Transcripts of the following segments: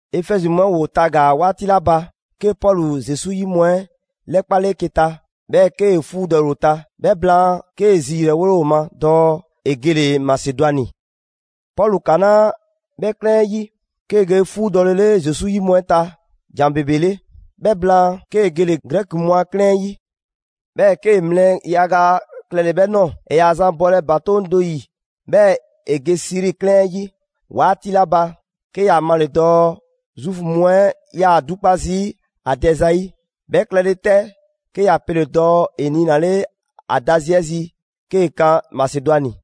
Efɛzi mu 'ɛ ‑woo tagaa‑ 'waati 'la ba, 'ke Pɔlu Zesu 'yi mu 'ɛ 'lɛkpale 'eke‑ ta, 'bhɛɛ‑ 'kee‑ 'fuudɔle ‑o ta. 'Bhɛ blaan, 'kee‑ zi ‑yrɛwole ‑o ma dɔɔ ‑e gele‑ Masedwani. Pɔlu 'kanaa 'bhɛ 'klɛɛn 'ɛ 'yi, 'kee‑ ge 'fuudɔlele Zesu 'yi mu 'ɛ ta ‑jan ‑bebe 'le. 'Bhɛ blaan, 'kee‑ gele‑ Grɛki mu a 'klɛɛn 'ɛ 'yi. 'Bhɛɛ‑ 'kee‑ mlɛ yaga klɛle‑ 'bhɛ ꞊nɔɔ. ‑E ‑yaa zan bɔlɛ ‑batoŋ' do ‑yi 'bhɛɛ‑ ‑e ge Siri 'klɛɛn 'ɛ 'yi 'waati 'la ba, 'ke ‑ya male‑ dɔɔ Zuufu mu 'ɛ 'yaa‑ 'dukpa zii' ‑a dɛ zayi'. 'Bhɛ klɛle 'tɛ, 'ke ‑ya pele‑ dɔɔ ‑e niinale ‑a da zi 'ɛ zi 'kee‑ kan Masedwani.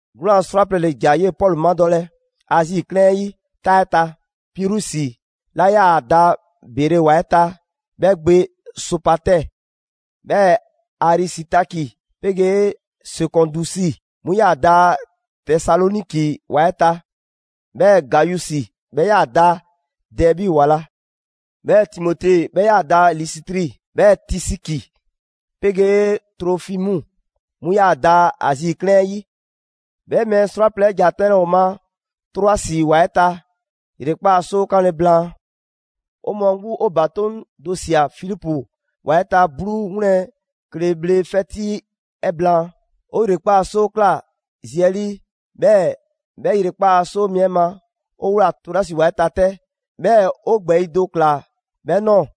'Gwlaan‑ 'srwaplɛ‑ ‑le ‑ja 'yee‑ Pɔlu madɔlɛ Azi 'klɛɛn 'ɛ 'yi 'taa 'ɛ ta: Pirusi 'la 'yaa‑ da Bere ‑wa 'ɛ ta 'bhɛ gbe Sopatɛɛ, 'bhɛɛ‑ Arisitaki 'pegee Sekɔndusi, 'mu 'yaa‑ da Tesaloniki ‑wa 'ɛ ta; 'bhɛɛ‑ Gayusi, 'bhɛ 'yaa‑ da Dɛɛbi ‑wa la, 'bhɛɛ‑ Timote, 'bhɛ 'yaa‑ da Lisitri, 'bhɛɛ‑ Tisiki 'pegee Trofimu: 'mu 'yaa‑ da Azi 'klɛɛn 'ɛ 'yi. 'Bhɛ mɛɛ 'srwaplɛ‑ 'ɛ ‑ja 'tɛnlɛ‑ 'o ma Troasi ‑wa 'ɛ ta ‑yrekpaa' 'soo 'kanle‑ blaan. 'O mɔɔ 'gbu, 'o ‑batoŋ' do ꞊sia Filipu ‑wa 'ɛ ta 'bluu 'wlɛn kle bhle 'fɛti 'ɛ blaan. 'O ‑yrekpaa' 'soo ꞊kla zi 'ɛ 'lii 'bhɛɛ‑ 'bhɛ ‑yrekpaa' 'soo mi 'ɛ ma, 'o ꞊wlaa Troasi ‑wa 'ɛ ta 'tɛ. 'Bhɛɛ‑ 'o ‑gbɛɛyi' do ꞊kla 'bhɛ ꞊nɔɔ.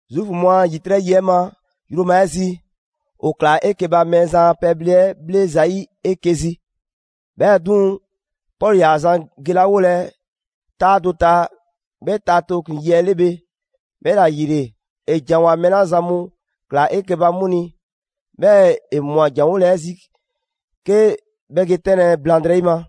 Zuufu mu a ‑yitrɛ' yi 'ɛ ma yroma 'ɛ zi, 'o ꞊klaa 'eke‑ ba Mɛɛzan a pɛbhle 'ɛ 'bhle zayi' 'eke‑ zi. 'Bhɛɛ‑ 'duŋ‑, Pɔlu ‑yaa zan gelawolɛ 'taa do ta 'bhɛ ta tooklin‑ yi 'ɛ 'le bhe, 'bhɛla‑ ‑yile, ‑e ‑janwoa mɛɛ 'la zan mu ꞊klaa 'eke‑ ba 'mu ni. 'Bhɛɛ‑ ‑e꞊mwa ‑janwole 'ɛ zi 'ke 'bhɛ ge 'tɛnlɛ‑ blaŋdrɛyi ma.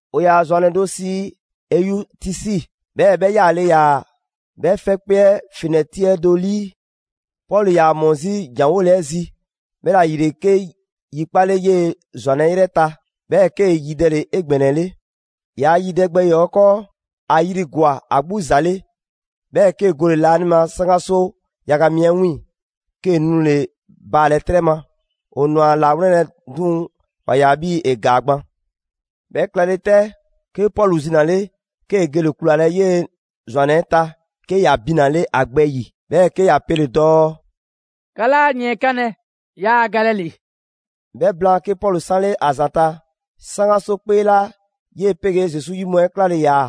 ‑O ‑yaa ‑zwannɛ do sii Eyutisi, 'bhɛɛ‑ 'bhɛ 'yaale‑ ‑yaa 'bhɛ 'fɛkpee 'ɛ fenɛti 'ɛ do ‑lii. Pɔlu ‑yaa ‑mɔ 'zi ‑janwole 'ɛ zi, 'bhɛla‑ ‑yile 'ke yi 'kpale 'yee‑ ‑zwannɛ 'ɛ 'yrɛ ta, 'bhɛɛ‑ 'kee‑ yidɛle 'egbɛnɛle. ‑Yaa' yidɛ gbɛ ‑yɔɔ' 'ɛ 'kɔɔ, ‑a yri ‑gwa ‑a 'gbu ‑za 'le, 'bhɛɛ‑ 'kee‑ gole‑ laanima 'saŋgaso yaga mi 'ɛ 'wiiŋ‑, 'kee‑ nule‑ baalɛ 'trɛ ma. ‑O ꞊nwa ‑a ‑lawlɛnlɛ, 'duŋ‑ ‑wa ꞊ya 'bhii‑ ‑e ‑gaa gban. 'Bhɛ klɛle 'tɛ, 'ke Pɔlu zinale, 'kee‑ gele‑ kulalɛ 'yee‑ ‑zwannɛ 'ɛ ta, 'ke ‑ya binale ‑a gbɛ ‑yi, 'bhɛɛ‑ 'ke ‑ya pele‑ dɔɔ: «'Ka 'laa yiɛnkanlɛ, yaa galɛ ‑li!» 'Bhɛ blaan, 'ke Pɔlu 'sanle ‑a ‑zanta' 'saŋgaso 'kpee 'la 'yee‑ 'pegee Zesu 'yi mu 'ɛ 'klale‑ ‑yaa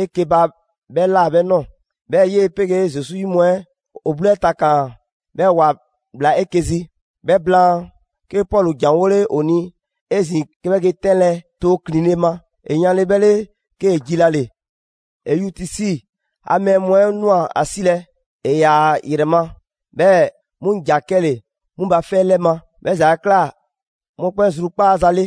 'eke‑ ba 'bhɛ ꞊la 'bhɛ ꞊nɔɔ. 'Bhɛɛ‑ 'yee‑ 'pegee Zesu 'yi mu 'ɛ ‑o 'bluu 'ɛ takaan‑, 'bhɛɛ‑ ‑wa ꞊bhla 'eke‑ zi. 'Bhɛ blaan, 'ke Pɔlu ‑janwole ‑o ni 'ezin‑, 'ke 'bhɛ ge 'tɛnlɛ tooklinle ma. ‑E yanle 'bhɛ 'le, 'kee‑ jilale. Eyutisi a mɛɛ mu 'ɛ ꞊nwa ‑a 'silɛ‑, ‑e ‑yaa ‑a ‑yrɛ ma; 'bhɛɛ‑ 'mu ‑ja 'kɛle‑ 'mu ba 'fɛ 'lɛ ma. 'Bhɛ ‑za 'ɛ ꞊kla mɔkpɛn' zrukpaaza 'le.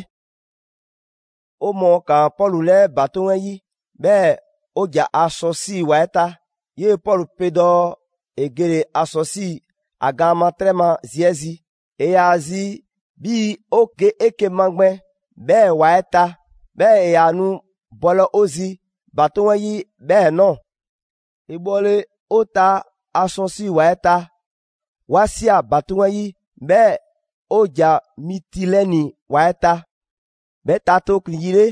'O mɔɔ ‑kaan Pɔlu 'lɛɛ ‑batoŋ' 'ɛ 'yi, 'bhɛɛ‑ 'o ‑ja Asɔsi ‑wa 'ɛ ta. 'Yee‑ Pɔlu pe dɔɔ ‑e gele‑ Asɔsi ‑a gaan ma 'trɛ ma zi 'ɛ zi. ‑E ‑yaa zi 'bhii‑ 'o ge 'eke‑ magbɛn 'bhɛɛ‑ ‑wa 'ɛ ta, 'bhɛɛ‑ ‑e ‑yaa nu bɔlɛ 'o zi ‑batoŋ' 'ɛ 'yi 'bhɛɛ‑ ꞊nɔɔ. ‑E bhɔle 'o ta Asɔsi ‑wa 'ɛ ta, 'wa ꞊sia ‑batoŋ' 'ɛ 'yi, 'bhɛɛ‑ 'o ‑ja Mitilɛni ‑wa 'ɛ ta. 'Bhɛ ta tooklin‑ yi 'le,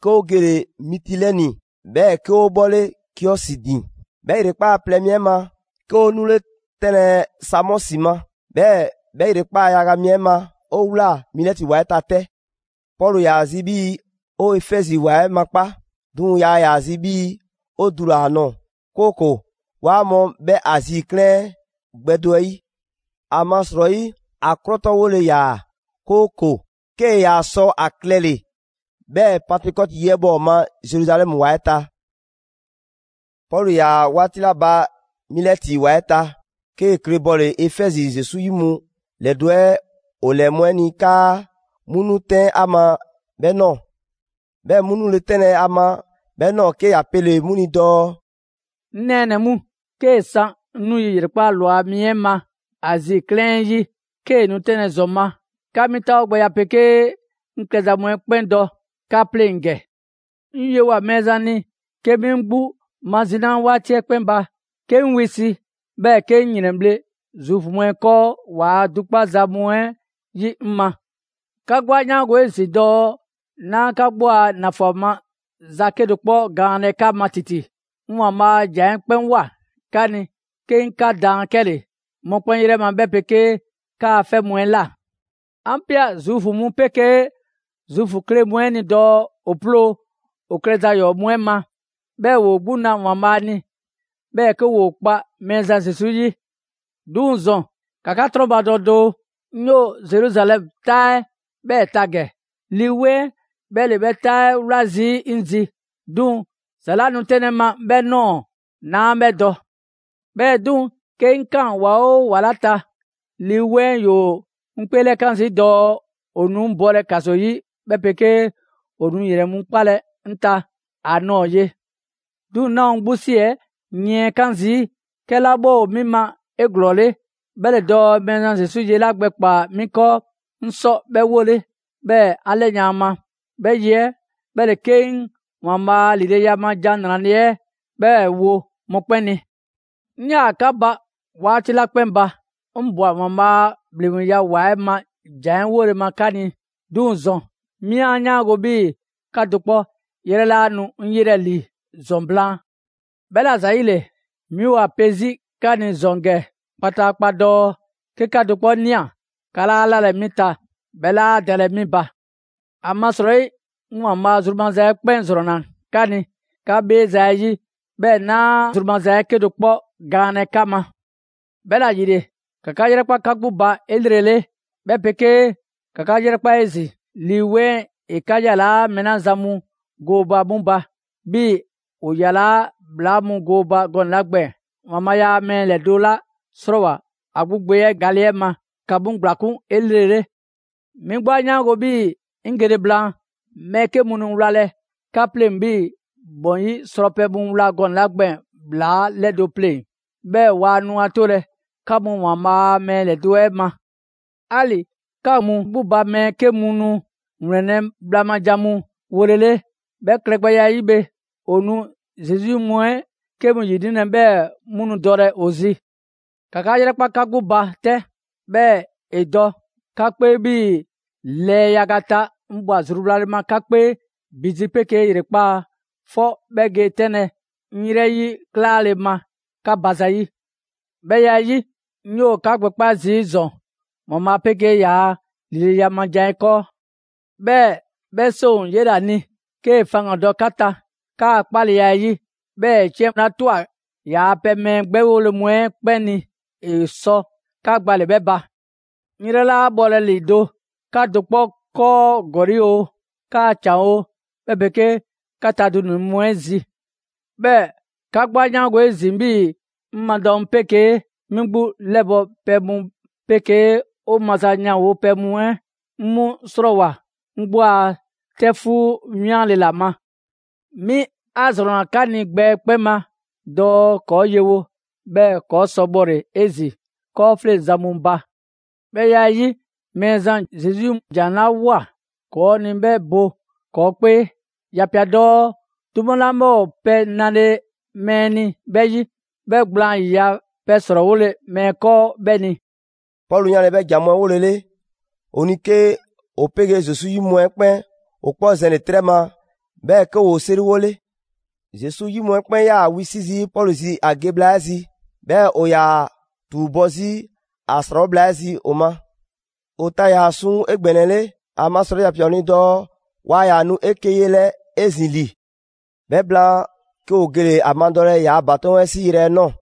'ke 'o gole‑ Mitilɛni, 'bhɛɛ‑ 'ke 'o 'bhɔle Kiɔsi ‑din. 'Bhɛ ‑yrekpaa' plɛ mi 'ɛ ma, 'ke 'o 'nule 'tɛnlɛ‑ Samɔsi ma. 'Bhɛɛ‑ 'bhɛ ‑yrekpaa' yaga mi 'ɛ ma 'o ꞊wlaa Milɛti ‑wa 'ɛ ta 'tɛ. Pɔlu ‑yaa zi 'bhii‑ 'o Efɛzi ‑wa 'ɛ makpa', 'duŋ‑ yaa ‑yaa zi 'bhii‑ 'o dula‑ ‑a nɔɔ‑; 'kooko‑ 'waa mɔ 'bhɛ Azi 'klɛɛn 'ɛ gbɛ do 'ɛ 'yi. ‑Amasrɔyi ‑a 'krɔtɔwole ‑yaa, 'kooko‑ 'kee‑ ‑yaa sɔ a klɛle‑ 'bhɛɛ‑ Pantekɔti yi 'ɛ bhɔ 'o ma Zeruzalɛmu ‑wa 'ɛ ta. Pɔlu ‑yaa 'waati 'la ba Milɛti ‑wa 'ɛ ta, 'kee‑ kle bɔle‑ Efɛzi Zesu 'yi mu ‑lɛdo' 'ɛ ‑o 'lɛɛ mu 'ɛ ni, 'kaa 'mu 'nu 'tɛn ‑a ma 'bhɛ ꞊nɔɔ. 'Bhɛ mu nule 'tɛnlɛ‑ ‑a ma 'bhɛ ꞊nɔɔ, 'ke ‑ya pele‑ 'mu ni dɔɔ: «'Ŋ nɛɛnɛ‑ mu, 'kee‑ san 'ŋ 'nu yi ‑yrekpaa' ꞊lwa mi 'ɛ ma Azi 'klɛɛn 'ɛ 'yi, 'kee‑ nu 'tɛnlɛ‑ ‑zɔn ma, 'ka 'mi 'taawogbɛya 'pegee 'ŋ klɛza mu 'ɛ 'kpɛn dɔ 'ka 'pleŋ ‑gɛ. 'Ŋ yewoa꞊ Mɛɛzan ni 'ke 'mi 'ŋ 'gbu mazinaa 'waati 'ɛ 'kpɛn ba, 'ke 'ŋ wisi, 'bhɛɛ‑ 'ke 'ŋ ‑yrɛnbhle' Zuufu mu 'ɛ 'kɔɔ ‑waa' 'dukpaza mu 'ɛ 'yi 'ŋ ma. 'Ka 'gbu 'a 'yaango‑ 'ezin‑ dɔɔ 'naa 'ka 'gbu a ‑nafan maza 'kedo‑ 'kpɔ gaanlɛ 'ka ma ‑titi. 'Ŋ ‑Waanbhaa' a ‑jan 'ɛ 'kpɛn ꞊woa 'ka ni 'ke 'ŋ 'ka daan 'kɛle‑, mɔkpɛn' 'yrɛ ma 'bhɛ 'pegee 'kaa‑ 'fɛ mu 'ɛ꞊la. 'An ꞊pia Zuufu mu 'pegee Zuufu kle mu 'ɛ ni dɔɔ ‑o 'ploo‑ ‑o klɛza ‑yɔɔ' mu 'ɛ ma, 'bhɛɛ‑ ‑woo 'gbu na ‑Waanbhaa' ni, 'bhɛɛ‑ 'ke ‑woo 'kpa Mɛɛzan Zesu 'yi. 'Duŋ‑ ‑zɔn, ‑ka 'ka 'trɔnbadɔ doo, 'ŋ 'yoo‑ Zeruzalɛmu 'taa 'ɛ 'bhɛɛ‑ ta ‑gɛ. Lii 'Weŋ 'ɛ 'bhɛ ‑le 'bhɛ 'taa 'ɛ 'wla zii' 'ŋ zi, 'duŋ‑ ‑za 'la nu 'tɛnlɛ‑ 'ŋ ma 'bhɛ ꞊nɔɔ, 'naa 'bhɛ dɔ. 'Bhɛɛ‑ 'duŋ‑, 'ke 'ŋ ꞊kaan ‑wa 'oo ‑wa 'la ta, Lii 'Weŋ 'ɛ ‑yoo 'ŋ 'kpeelɛkan zii' dɔɔ ‑o nu 'ŋ bɔlɛ ‑kaso 'yi 'bhɛ pegee ‑o nu ‑yrɛn mu 'kpalɛ‑ 'ŋ ta ‑a ꞊nɔɔ ye. 'Duŋ‑ 'naa ‑o 'ŋ 'gbu ‑si 'ɛ yiɛnkan zii'. 'Kɛla 'bhɛ ‑o 'mi ma 'eglɔɔle 'bhɛ ‑le dɔɔ Mɛɛzan Zesu ye 'la gbɛkpaa‑ 'mi 'kɔɔ, 'ŋ sɔ 'bhɛ 'wole, 'bhɛɛ‑ 'an 'lɛyan‑ ‑a ma. 'Bhɛ ye 'ɛ 'bhɛ ‑le 'ke 'ŋ ‑Waanbhaa' a ‑lileya ma ‑Jan 'Nrale‑ 'ɛ 'bhɛɛ‑ 'wo mɔkpɛn' ni.» «'Ŋ 'yaa‑ 'ka ba 'waati 'la 'kpɛn ba, 'ŋ ꞊bwa ‑Waanbhaa' a ‑bhleŋgbeya ‑wa 'ɛ ma jan 'ɛ wole ma 'ka ni; 'duŋ‑ ‑zɔn 'mi 'a 'yaango‑ 'bhii‑ 'ka do 'kpɔ 'yrɛ 'laa nu 'ŋ 'yelɛ‑ ‑li ‑zɔn blaan. 'Bhɛla‑ ‑zayile, 'mi ‑o ‑a pe 'zi 'ka ni ‑zɔn ‑gɛ kpataakpa dɔɔ: 'ke 'ka do 'kpɔ ꞊nia, 'ka 'laa 'lalɛ‑ 'mi ta, 'bhɛ 'laa dalɛ 'mi ba. ‑Amasrɔyi 'ŋ ‑Waanbhaa' zru maza 'ɛ 'kpɛn ‑zrɔnna 'ka ni 'ka 'bheeza‑ 'ɛ 'yi, 'bhɛɛ‑ 'naa a zru maza 'ɛ 'kedo‑ 'kpɔ gaanlɛ 'ka ma. 'Bhɛla‑ ‑yile, ‑ka 'ka 'yrɛkpa 'ka 'gbu ba 'elrele, 'bhɛ 'pegee ‑ka 'ka 'yrɛkpa 'ezin‑ Lii 'Weŋ 'ɛ ‑e 'ka 'yalaa mɛɛ 'la zan mu gooba 'mu ba, 'bhii‑ ‑o yalaa' ‑bhlaa mu gooba gɔnɛ‑ 'la gbɛɛn‑. ‑Waanbhaa' ‑yaa' mɛɛ ‑lɛdo' 'la 'srɔɔwoa‑ ‑a 'gbu Gbe 'ɛ gale 'ɛ ma, ‑ka 'mu ‑gblakun' 'elrele. 'Mi 'gbu 'a 'yaango‑ 'bhii‑ 'ŋ gele blaan, mɛɛ 'ke mu nu wlalɛ 'ka pleŋ‑ 'bhii‑ ‑bɔn 'yi srɔpɛ mu wla gɔnɛ‑ 'la gbɛɛn‑ ‑bhlaa 'lɛdo‑ pleŋ‑; 'bhɛɛ‑ waa nu ‑a 'tolɛ‑ 'ka mu ‑Waanbhaa' a mɛɛ ‑lɛdo' 'ɛ ma. 'Ali‑ 'ka mu 'gbu ba mɛɛ 'ke mu nu ‑wlɛnlɛ' bhla ma ‑jan mu wolele, 'bhɛ klɛgbɛya 'ɛ 'yi bhe, ‑o nu Zesu 'yi mu 'ɛ 'ke mu ‑yinilɛ; 'bhɛɛ‑ 'mu nu dɔlɛ ‑o zi. ‑Ka 'ka 'yrɛkpa 'ka 'gbu ba 'tɛ, 'bhɛɛ‑ ‑e dɔ 'ka 'kpee 'bhii‑ lɛɛ yaga ta 'ŋ ꞊bwa zruwlale ma 'ka 'kpee ‑bi zi 'pegee ‑yrekpaa' 'fɔ 'bhɛ ge 'tɛnlɛ‑ 'ŋ 'yrɛ 'yi 'klaale‑ ma 'ka ba ‑zayi'.» «'Bhɛ ya 'ɛ 'yi, 'ŋ 'yoo‑ 'ka gbɛkpa' zii' ‑zɔn ‑Waanbhaa' 'pegee ‑yaa' ‑lileya ma ‑jan 'ɛ 'kɔɔ. 'Bhɛɛ‑ 'bhɛ 'seŋ ‑o 'yela‑ ni 'kee‑ faŋgan‑ dɔ 'ka ta 'kaa‑ 'kpaleya 'ɛ 'yi, 'bhɛɛ‑ ‑e 'ciɛn 'la 'twa‑ ‑yaa pɛ mɛɛ 'gbɛwole mu 'ɛ 'kpɛn ni ‑e sɔ 'ka gbale‑ 'bhɛ ba. 'Ŋ 'yrɛ 'laa 'bhɔlɛ‑ ‑lido' 'ka do 'kpɔ 'kɔɔ ‑gɔli' oo, 'kaa‑ ‑can oo 'bhɛ 'pegee 'ka ta dunɛ‑ mu 'ɛ zi. 'Bhɛɛ‑ 'ka 'gbu 'a 'yaango‑ 'ezin‑ 'bhii‑ 'ŋ madɔ mu 'pegee 'mi 'gbu 'lɛbɔ‑ pɛ mu 'pegee 'o maza ‑yanwo' pɛ mu 'ɛ 'ŋ 'mu 'srɔɔwoa꞊ 'ŋ 'gbu a 'tɛfuu 'wianle‑ ‑la ma. 'Mi 'a ‑zrɔnna 'ka ni gbɛ 'ɛ 'kpɛn ma dɔɔ ‑kɔɔ' yewo, 'bhɛɛ‑ ‑kɔɔ' sɔ bhɔle‑ 'ezin‑ 'kɔɔfleŋzan mu ba. 'Bhɛ ya 'ɛ 'yi, Mɛɛzan Zesu ‑jan 'la ꞊woa ‑kɔɔ' ni 'bhɛ bo ‑kɔɔ' 'kpee; ‑ya 'pia‑ dɔɔ: ‹'Duma 'la 'bhɛ ‑o pɛ nale mɛɛ ni 'bhɛ 'yi, 'bhɛ gblaan ‑yiya' pɛ ‑srɔɔwole mɛɛ 'kɔɔ 'bhɛ ni.›» Pɔlu 'yanle‑ 'bhɛ ‑jan mu 'ɛ 'wolele ‑o ni, 'ke ‑o 'pegee Zesu 'yi mu 'ɛ 'kpɛn ‑o 'kpɔ zɛnle‑ 'trɛ ma, 'bhɛɛ‑ 'ke ‑woo 'seriwole. Zesu 'yi mu 'ɛ 'kpɛn 'yaa‑ wisi' zii' Pɔlu zi ‑a ge bhla 'ɛ zi, 'bhɛɛ‑ ‑o ‑yaa ‑a ‑tuubɔ' 'zi ‑a ‑srawo' bhla 'ɛ zi ‑o ma. ‑O ta ‑yaa suŋ 'egbɛnɛle, ‑amasrɔyi ‑ya ꞊pia ‑o ni dɔɔ waa ‑yaa nu 'eke‑ yelɛ 'ezin‑ ‑li. 'Bhɛ blaan, 'ke ‑o gele‑ ‑a madɔlɛ ‑yaa' ‑batoŋ' 'ɛ 'si yrɛ nɔɔ‑.